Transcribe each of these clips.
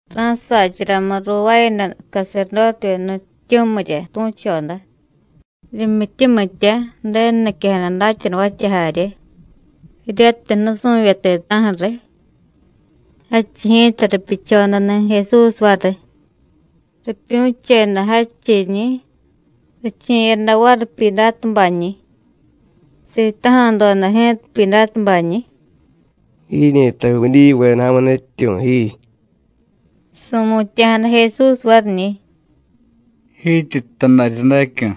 Ra̱sacharamu ruuvaayada caserdótevyeda nutyityu̱mirya tu̱choda, rimyityumitya, Ju̱denu niquejada datyanuvatya jarye, jiryatiy nusu̱vye ti̱ta̱ju̱ riy. Jadchiy ji̱ta ripyuchodani̱ Jesús variy; ripyu̱cheda jadchiñi̱, riche̱yada variy Pyidátubañi̱. Sitaja̱doda ji̱ta Pyidátubañi̱: “¿Jiñi̱ta Judíyuveda ja̱mu nutyityu̱ ji?” Su̱mutya̱jada Jesús variñi̱: “Jityi jtay daryadacyu̱.”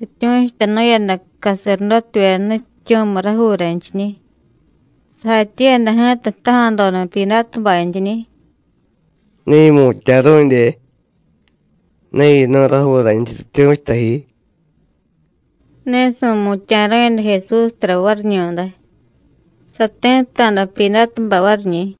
Rityu̱chutanu̱yada caserdótevyeda nutyityu̱miy rajuuranchiñi̱. Sajatyiiyada ji̱ta jtaja̱doda Pyidátubantyiñi̱: “¿Ne yimutya̱ru̱dye? ¿Ne yinu̱y rajuuranchiy rityu̱chuta ji?” Ne su̱mutya̱ru̱yada Jesús tara variñu̱day. Sati̱tta̱da Pyidátubay variñi̱.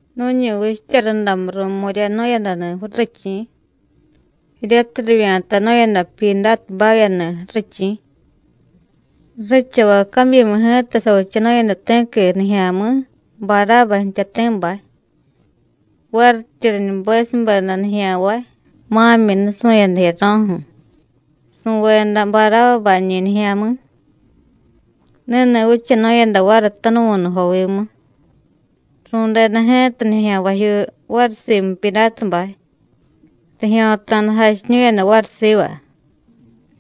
Nu̱ñi vichtya rundamu ru̱mu̱ryanu̱yadani̱ ju̱richi̱, jiryatiy rivya̱tanu̱yada Pyidátubavyani̱ ju̱richi̱. Ju̱richavay cabyimu ji̱ta savichanu̱yada ti̱qui nijya̱mi̱, Barába jtyati̱bay. Varityi riñubesubeda nijya̱nvay, ma̱myi nusu̱yada jiyaro̱ju̱, su̱veda Barábabañi̱ nijya̱mi̱. Ni̱ni̱ vichanu̱yada variy tanuvu̱nujovimu. Ru̱deda ji̱ta nijya̱nvajyuu variy simu Pyidátubay, rijyo̱ta̱da jachiñu̱yada variy siva: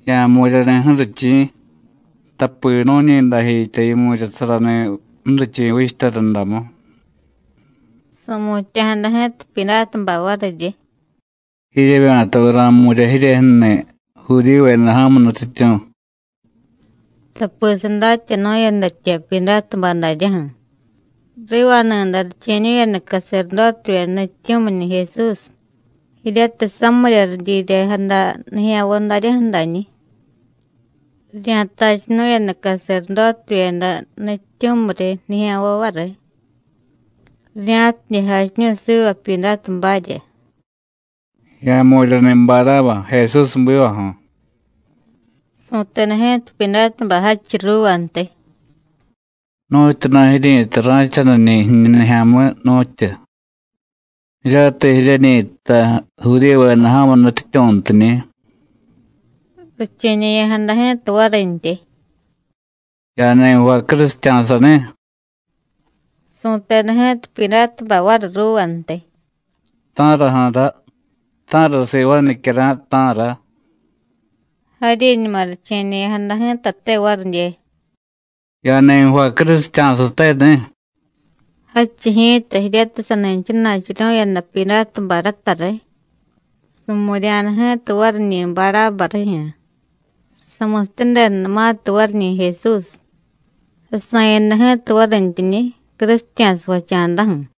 “Ya̱jmu̱ryani̱ ju̱richi̱, tapi nu̱ñi dajitya yimu̱ryasarani̱ ju̱richi̱ vichtya rundamu.” Su̱mutya̱jada ji̱ta Pyidátubay variryi: “¿Jiryevya̱taviy ra̱jmu̱rya jiryejyu̱ni̱ Judíyuveda ja̱mu nutyityu̱?” Tapi sadatyanu̱yadatya Pyidátubay daryaju̱: rivani̱day riche̱ñu̱yada caserdótevyeda nutyityu̱miñi̱ Jesús, jiryatiy samirya ridyiryejada nijya̱nvay daryaju̱ dañi̱. Rirya̱tachunu̱yada caserdótevyeda nutyityu̱miryi nijya̱nvay variy, rirya̱tidye jachiñu̱y siva Pyidátubarya: “Ya̱jmu̱ryani̱ Barába, Jesús ju̱bivaju̱.” Su̱teda ji̱ta Pyidátubay jadchiy ruuvantiy: “¿Nu̱tyuna̱ jiryi̱tay ra̱chaniñi̱ jiñu nijya̱mi̱, nu̱tyu? jiryatiy jiryeñi jtay Judíyuveda ja̱mu nutyityu̱ntiñi̱.” Riche̱ñe̱ya̱jada ji̱ta varintyi: “Ya̱ni jvay crusitya̱sani̱.” Su̱teda ji̱ta Pyidátubay variy ruuvantiy: “¿Ta̱raju̱ra? ¿Ta̱ra sivaay nicyara̱y, ta̱ra?” Jaryiñuma riche̱ñe̱ya̱jada ji̱tate varidye: “Ya̱ni jvay crusitya̱sateni̱.” Jadchiy ji̱ta jiryatiy sani jchana̱churu̱yada Pyidátubay rata riy, su̱mu̱rya̱da ji̱ta variñi̱ Barába rijyu̱. Samusityadedanumatiy variñi̱ Jesús, sasa̱yada ji̱ta varintyiñi̱, crusitya̱sa jvacha̱daju̱.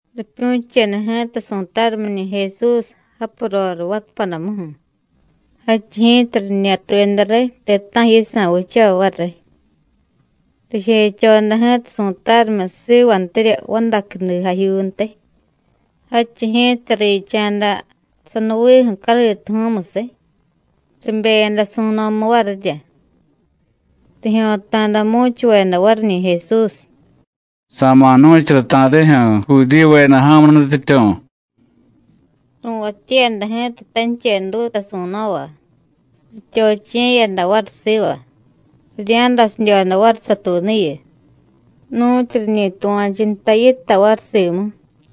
Ripyu̱cheda ji̱ta su̱tarumiñi̱ Jesús japu roriy vatapadamuju̱. Jadchiy ji̱ta riñatuyada riy ti̱ta̱ju̱ yisa̱ vichavay variy. Rijechoda ji̱ta su̱tarumiy sivantirya vadacudijajyuuntiy, jadchiy ji̱ta richa̱da sanuviiju̱ cariituju̱u̱musiy, ribeyada su̱no̱mu varirya. Rijyo̱ta̱da mu̱chuveda variñi̱ Jesús: “¡Sa̱ma̱ jnu̱chara ta̱rijyu̱ Judíyuveda ja̱mu nutyityu̱!” Ru̱vatyiyada ji̱ta tancheduta su̱no̱va, rityochiye̱yada variy siva, rirya̱dasidyoda variy satuunuyu, nu̱tyu riñi tuva̱chu nta yitay variy simu.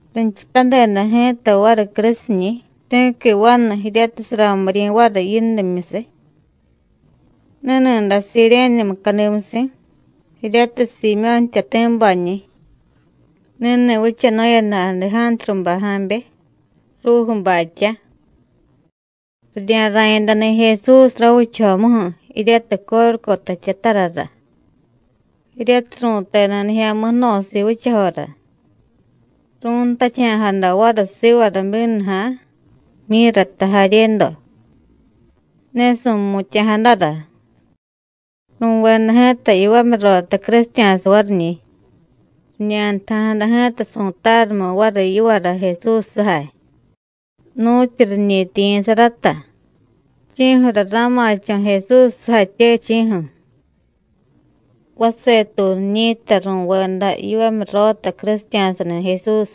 Rinchutadeda ji̱ta variy crusiñi̱ ti̱qui vanu jiryatiy saramiryi̱ variy yindimyusiy. Ni̱ni̱day Siréne mucadimusi̱, jiryatiy Siimyó̱ jtyati̱bañi̱. Ni̱ni̱ vichanu̱yada Adejántrubay ja̱be, Rújubatyá. Rirya̱ra̱yadani̱ Jesús ravichajomuju̱, jiryatiy Córucota jtyatarara, jiryatiy ru̱teda Nijya̱mi̱ Jno̱siiy Vichajora. Ru̱ntatyaja̱jada variy sivara bínuja̱, myírata jaryedo; ne su̱mutya̱jadara. Ru̱veda ji̱ta yivamyurota crusitya̱sa variñi̱. Riñantaja̱jada ji̱ta su̱tarumiy variy yivara Jesús sujay, nu̱tyu riñi tiyi̱sa rata, chi̱ju̱ra ra̱ma̱cho̱ Jesús sujatye, chi̱ju̱. Vasetuunu jiñi̱ta ru̱veda yivamyurota crusitya̱sani̱ Jesús.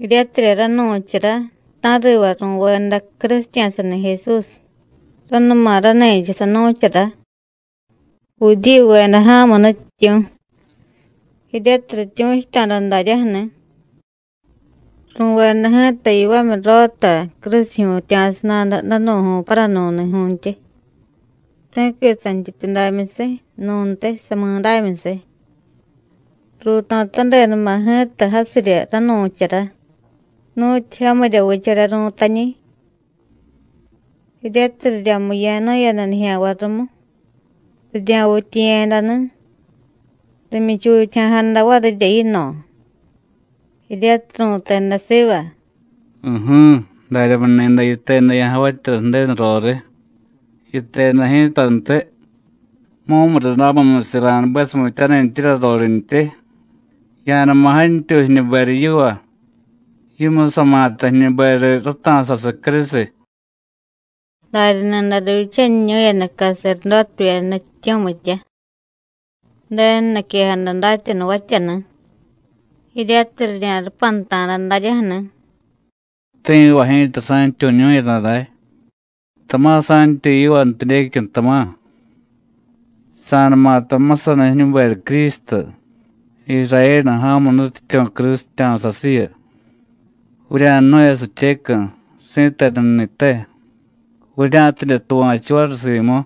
Jiryatirya ranu̱chara ta̱riva ru̱veda crusitya̱sani̱ Jesús, ranuma rani̱cha sanu̱chara: “Judíyuveda ja̱mu nutyityu̱,” jiryatiy rityu̱chuta̱da daryaju̱ni̱. Ru̱veda ji̱ta yivamyurota crusijyu̱tya̱sa nada danu̱ju̱y paranu̱ni̱ju̱ntyi, ti̱qui santyityudamyusiy, nu̱ntiy samidámyusiy. Ruuto̱tadedama̱ ji̱ta jasirya ranu̱chara: “Nu̱tyu jamirya vichara ru̱tañi̱.” Jiryatiy riryamiya̱nu̱yada nijya̱nvay rumu, rirya̱vityiye̱yadani̱, rimyichutyaja̱jada varirya yino̱, jiryatiy ru̱teda siva: “U̱ju̱, daryamuni̱day yiteda ya̱javatyara Ju̱denu roriy. Yiteda ji̱tantiy: Mumurundamimyusiy ra̱nubesumityanintyirya rorintyi. Ya̱numa jantyuy jiñuberiy yiva, yimusama̱ta jiñuberiy rata̱sasiy crusiy.” Darya ni̱day rivyichaniñu̱yada caserdótevyeda nutyityu̱mitya, Ju̱denu niquejada datyanuvatyani̱, jiryatiy rirya̱rupanta̱da daryaju̱ni̱: “Ti̱va ji̱ta sa̱ntyuñu̱yada day, tama̱ sa̱ntyuy yivantidyecyu̱, tama̱. Sa̱numata jmusaniy jiñuberiy Crístu, Irayénu ja̱mu nutyityu̱ crusitya̱sasiyu, vurya̱jnu̱yasityecu̱, si̱tenu ni̱te, vurya̱tidye tuva̱chu variy simu.”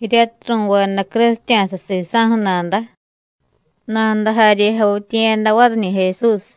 Jiryatiy ru̱veda crusitya̱sa sisa̱ju̱ nada, nada jarye javityiye̱yada variñi̱ Jesús.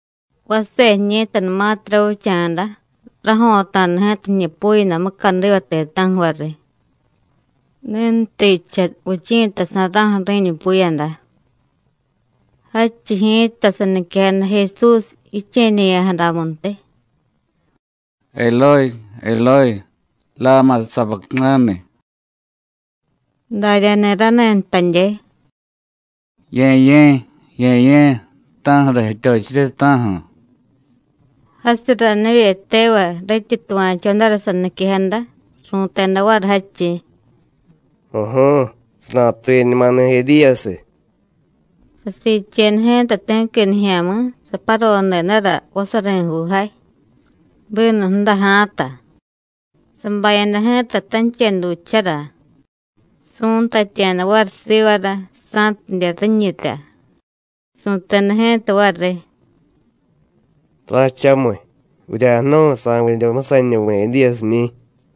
Vase jiñi̱tanumatiy ravicha̱da, rajo̱ta̱da ji̱ta ji̱ñupuyada mucadiva ti̱ta̱ju̱ variy, ni̱nutijcha vichi̱tasa̱ra̱ju̱ ri̱ñupuyada. Jadchiy ji̱ta, saniquejada Jesús jiche̱ñe̱ya̱jadamuntiy: “Elóy, Elóy, láma sabactáni.” Daryani̱ rani̱ jtadye: “Ye̱ye̱, Ye̱ye̱, ¿ta̱ju̱ra jityochirye, ta̱ju̱?” Jasiy ranivye tevay rityi tuva̱chodara saniquejada, ru̱teda variy jadchiy: “U̱ju̱u̱, sanatuye̱ñumani̱ Edíyasiy.” Sasiicheda ji̱ta ti̱qui nijya̱mi̱, saparodedara vasari̱juujay, bínu ju̱daja̱ta, sabayada ji̱ta tanchedujchara, su̱ntatya̱da variy sivara sa̱tidye riñirya, su̱teda ji̱ta variy: “Ra̱chamiy, vurya̱jnu̱y sa̱vidye jmusaniñuvi̱ Edíyasiñi̱.”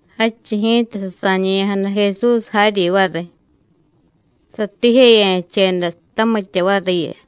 Jadchiy ji̱ta sasa̱ñe̱ya̱jada Jesús jaryi variy, satiijeya̱cheda tamitya variyu.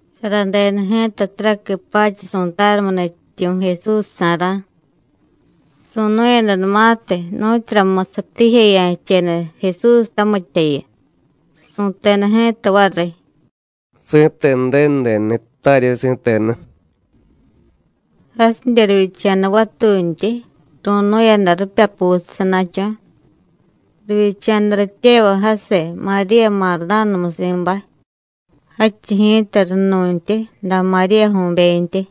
Saradeda ji̱ta taraqui pacha su̱tarumiy nutyityu̱ Jesúsjsa̱ra̱. Su̱nu̱yadanumatiy nu̱tyuramusiy satiijeya̱cheda Jesús tamityayu, su̱teda ji̱ta variy: “¡Si̱tenu Ju̱denu denuni̱ttarye, si̱tenu!” Jasidye rivyicha̱da vatuntyi, ru̱nu̱yada ripyapusiy sana̱cho̱. Rivyicha̱da rityevay jasiy Maríya Mardánamusi̱bay, jadchiy ji̱ta runu̱ntyi da Maríyaju̱bentyi,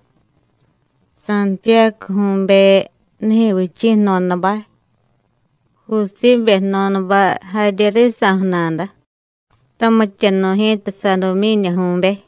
Santiyácuju̱be nijyu̱vichi̱ jno̱dabay, Jusíbe jno̱dabay jarye risa̱ju̱nada, tamityanu̱y ji̱ta Sadumyídyaju̱be.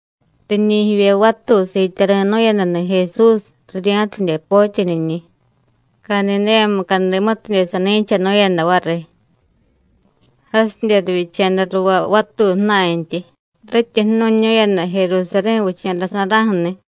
Riñi̱ jivye vatuy siityari̱nu̱yadani̱ Jesús, rirya̱tidye potyaniñi̱, Cadidéya mucadimutidye sani̱chanu̱yada variy. Jasidye rivyicha̱da ruvay vatuy ju̱na̱ntyi, rityi jnu̱ñu̱yada Jerusarí̱ vicha̱dasa̱ra̱ju̱ni̱.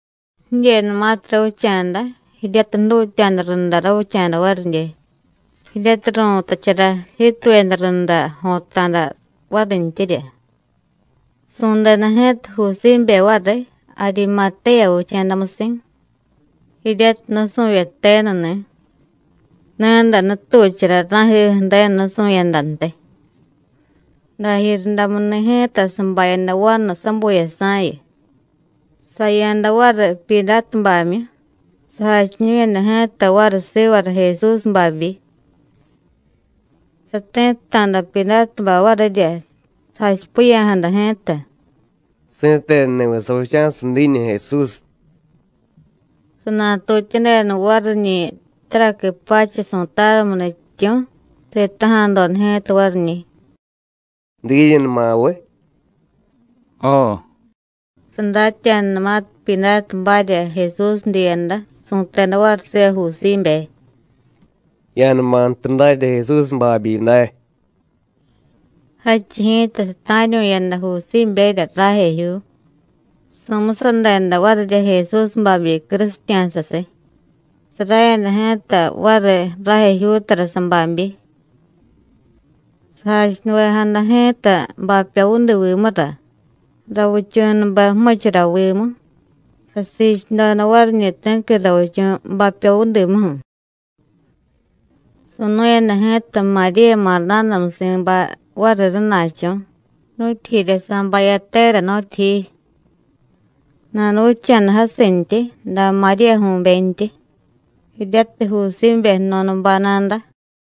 Jidyenumatiy ravicha̱da, jiryatiy jdutya̱da runda ravicha̱da varidye, jiryatiy ru̱tachara jiituyada runda jo̱ta̱da varintyirya, su̱deda ji̱ta Jusíbe variy, Arimatéya vicha̱damusi̱, jiryatiy nusu̱vye tenuni̱. Ni̱day nutuchara ra̱jiju̱ Ju̱denu nusu̱yadantiy. Dajiryundamuni̱ ji̱ta sabayada vanu sabuyasa̱yu, saya̱da variy Pyidátubamyu, sajachiñu̱yada ji̱ta variy sivara Jesús babyi. Sati̱tta̱da Pyidátubay varirya, sajachipiya̱jada ji̱ta: “¿Si̱tenuni̱viy savicha̱siy diiñu Jesús?” Sanatutyadeda variñi̱ taraqui pacha su̱tarumiy nutyityu̱, sitaja̱doda ji̱ta variñi̱: “¿Diiñunuma viy?” “Jo.” Sadatya̱danumatiy Pyidátubarya Jesús diiyada, su̱teda variy siva Jusíbe: “Ya̱numa jtu darya Jesús babyi day.” Jadchiy ji̱ta sata̱ryu̱yada Jusíberya rajejyuu, su̱musadeda varirya Jesús babyi crusitya̱sasiy, sarayada ji̱ta variy rajejyuutara sababyi. Sajachunuvejada ji̱ta bapyovudivimura, ravichu̱nube jmuchuravimu, sasiichudoda variñi̱ ti̱qui ravichu̱ bapyovudimuju̱. Su̱nu̱yada ji̱ta Maríya Mardánamusi̱bay variy rana̱cho̱, nu̱tyijirya sabayatera, nu̱tyijiy. Nanuvicha̱da jasintyi da Maríyaju̱bentyi, jiryatiy Jusíbe jno̱dabay nada.